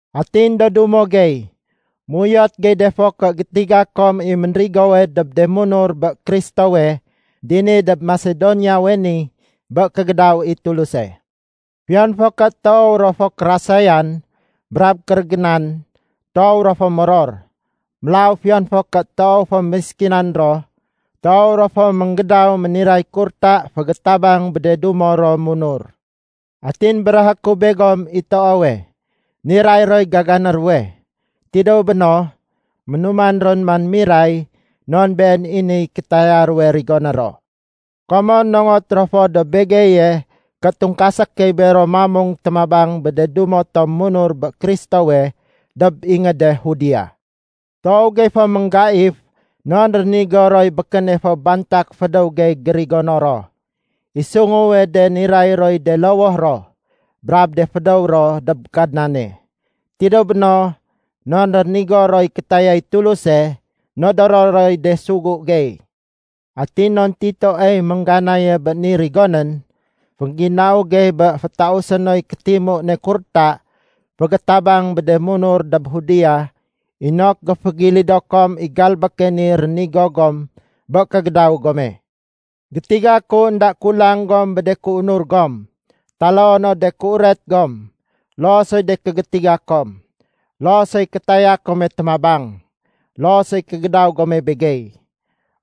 Atin do dumo gey, méuyot gey de fo ké gétiga kom i ménrigowe dob de munur bé Kristowe dini dob Masedoniawe ni bé kégédaw i Tuluse. Fiyon fo ké toow ro fo kérasayan brab kérégénan, toow ro fo moror. Mélaw fiyon fo ké toow fo méskinan ro, toow ro fo ménggédaw méniray kurta fégétabang bé de dumo ro munur. Atin béréhé ku begom i toowe, niray roy gagané ruwe. Tidéw béno, ménuman ron man miray non been i niy kétaya ruwe rigoné ro. Komon nongot ro fo dob begeye ké tungkasé key bero mamung témabang bé de dumo tom munur bé Kristowe dob ingéde Judea. Toow gey fo ménggaif non rénigo roy békéne fo bantak fédéw gey gérigono ro. I sunguwe de niray roy de lowoh ro brab de fédéw ro dob Kadnane. Tidéw béno, non rénigo roy kétayay Tuluse, nodoro roy de sugu gey. Atin non Titoey méngganaye bé ni rigonén, féngginau gey bé fétausé noy kétimu ne kurta fégétabang bé de munur dob Judea inok géfégilido kom i galbéke ni rénigo gom bé kégédaw gome. Gétiga ku énda kulang gom bé de kéunur gom, taloo no de kéuret gom, loo soy de kégétiga kom, loo soy kétaya kome témabang, loo soy kégédaw gome begey.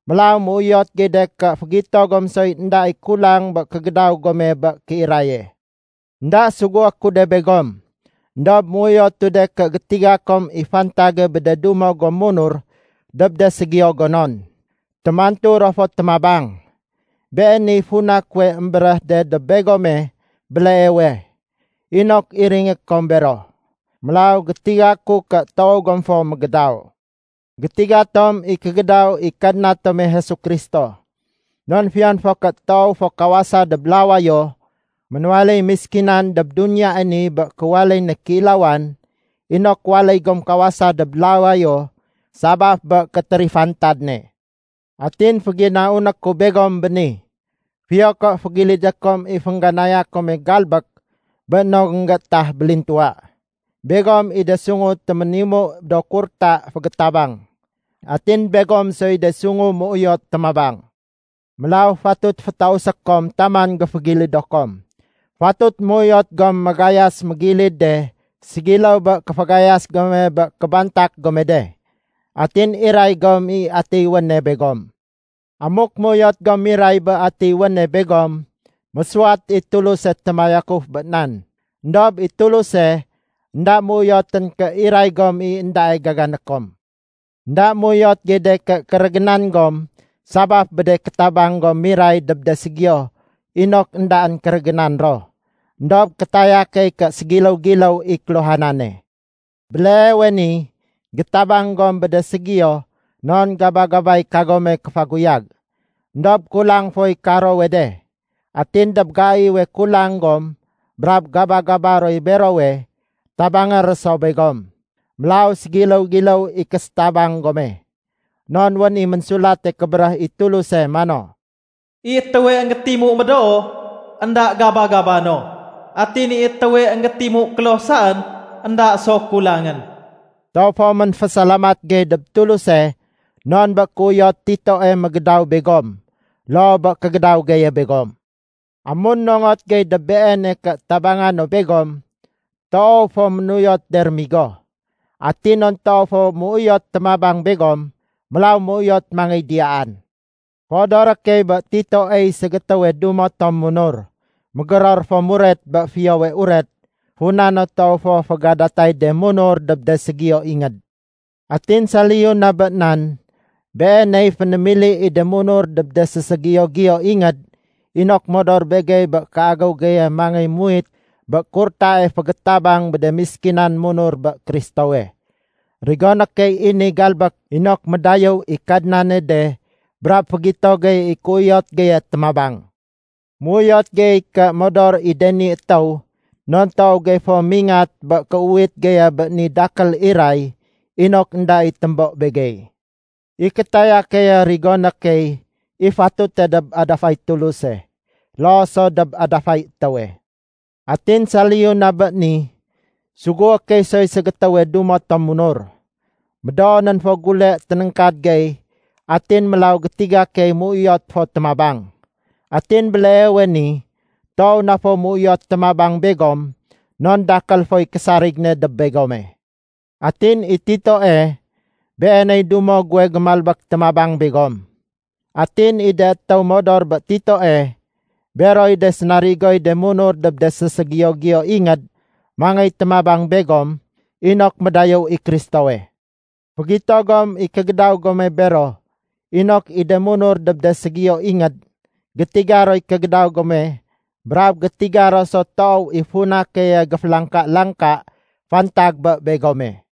Mélaw méuyot gey de ké fégito gom soy énda i kulang bé kégédaw gome bé kéiraye. Enda sugué ku de begom, éndob méuyotu de ké gétiga kom i fantage bé de dumo gom munur dob de ségiyo gonon. Témantu ro fo témabang. Beeniy funa kuwe émbéréh de dob begome béleewe, inok iringé kom bero. Mélaw gétiga ku ké toow gom fo mégédaw. Gétiga tom i kégédaw i Kadna tome Jesu Kristo. Non fiyon fo ké toow fo kawasa dob lawayo, ménwaléy méskinan dob duniyae ni bé kéwaléy ne kéilawan inok waléy gom kawasa dob lawayo sabaf bé kétérifantad ne. Atin féginauné ku begom béni, fiyo ké fégilidé kom i féngganaya kome galbék bé no énggéétah bélintuwa. Begom i de sungu téménimu do kurta fégétabang, atin begom soy de sungu méuyot témabang. Mélaw fatut fétausé kom taman géfégilido kom. Fatut méuyot gom magayas mégilid de ségiléw bé kéfagayas gome bé kébantak gome de. Atin iray gom i atiy wéne begom. Amuk méuyot gom miray bé atiy wéne begom, mésuwat i Tuluse témayakuf bé nan. Endob i Tuluse énda méuyotén ké iray gom i éndae gagané kom. Enda méuyot gey de ké kérégénan gom sabaf bé de kétabang gom miray dob de ségiyo inok éndaén kérégénan ro. Endob kétaya key ké ségiléw-giléw i kéluhanane. Béleewe ni gétabang gom bé de ségiyo non gaba-gabay kagome kéfaguyag. Endob kulang foy karowe de. Atin dob gaiwe kulang gom brab gaba-gaba roy berowe, tabangé ro so begom. Mélaw ségiléw-giléw i késétabang gome. Non wén i Ménsulate Kébéréh i Tuluse mano, “I étéwe énggétimu médoo, énda gaba-gaba no. Atin i étéwe énggétimu kloh saén, énda so kulangén.” Toow fo ménfésalamat gey dob Tuluse non bé kéuyot Titoe mégédaw begom loo bé kégédaw geye begom. Amun nongot gey dob beene ké tabanga no begom, toow fo ménuyot de rémigo. Atin non toow fo méuyot témabang begom, mélaw méuyot mangéy diyaan. Féodoré key bé Titoey ségétéwe dumo tom munur, mégéror fo muret bé Fiyowe Uret, funa no toow fo fégadatay de munur dob de ségiyo ingéd. Atin saliyu na bé nan, beeney fénémili i de munur dob de séségiyo-giyo ingéd inok modor begey bé kéagéw geye mangéy muwit bé kurtae fégétabang bé de méskinan munur bé Kristowe. Rigoné key i ni galbék inok médayéw i Kadnane de brab fégito gey i kéuyot geye témabang. Méuyot gey ké modor i de ni étéw non toow gey fo mingat bé kéuwit geye bé ni dakél iray inok énda i témbo begey. I kétaya keye rigoné key i fatute dob adafay Tuluse loo so dob adafay étéwe. Atin saliyu na bé ni, sugué key soy ségétéwe dumo tom munur. Médoonén fo gule ténéngkad gey atin mélaw gétiga key méuyot fo témabang. Atin béleewe ni toow na fo méuyot témabang begom non dakél foy késarig ne dob begome. Atin i Titoe, beeney dumo guwe gémalbék témabang begom. Atin i de étéw modor bé Titoe, beroy de sénarigoy de munur dob de séségiyo-giyo ingéd mangéy témabang begom inok médayéw i Kristowe. Fégito gom i kégédaw gome bero inok i de munur dob de ségiyo ingéd gétiga roy kégédaw gome brab gétiga ro so toow i funa keye géfélangka-langka fantag bé begome.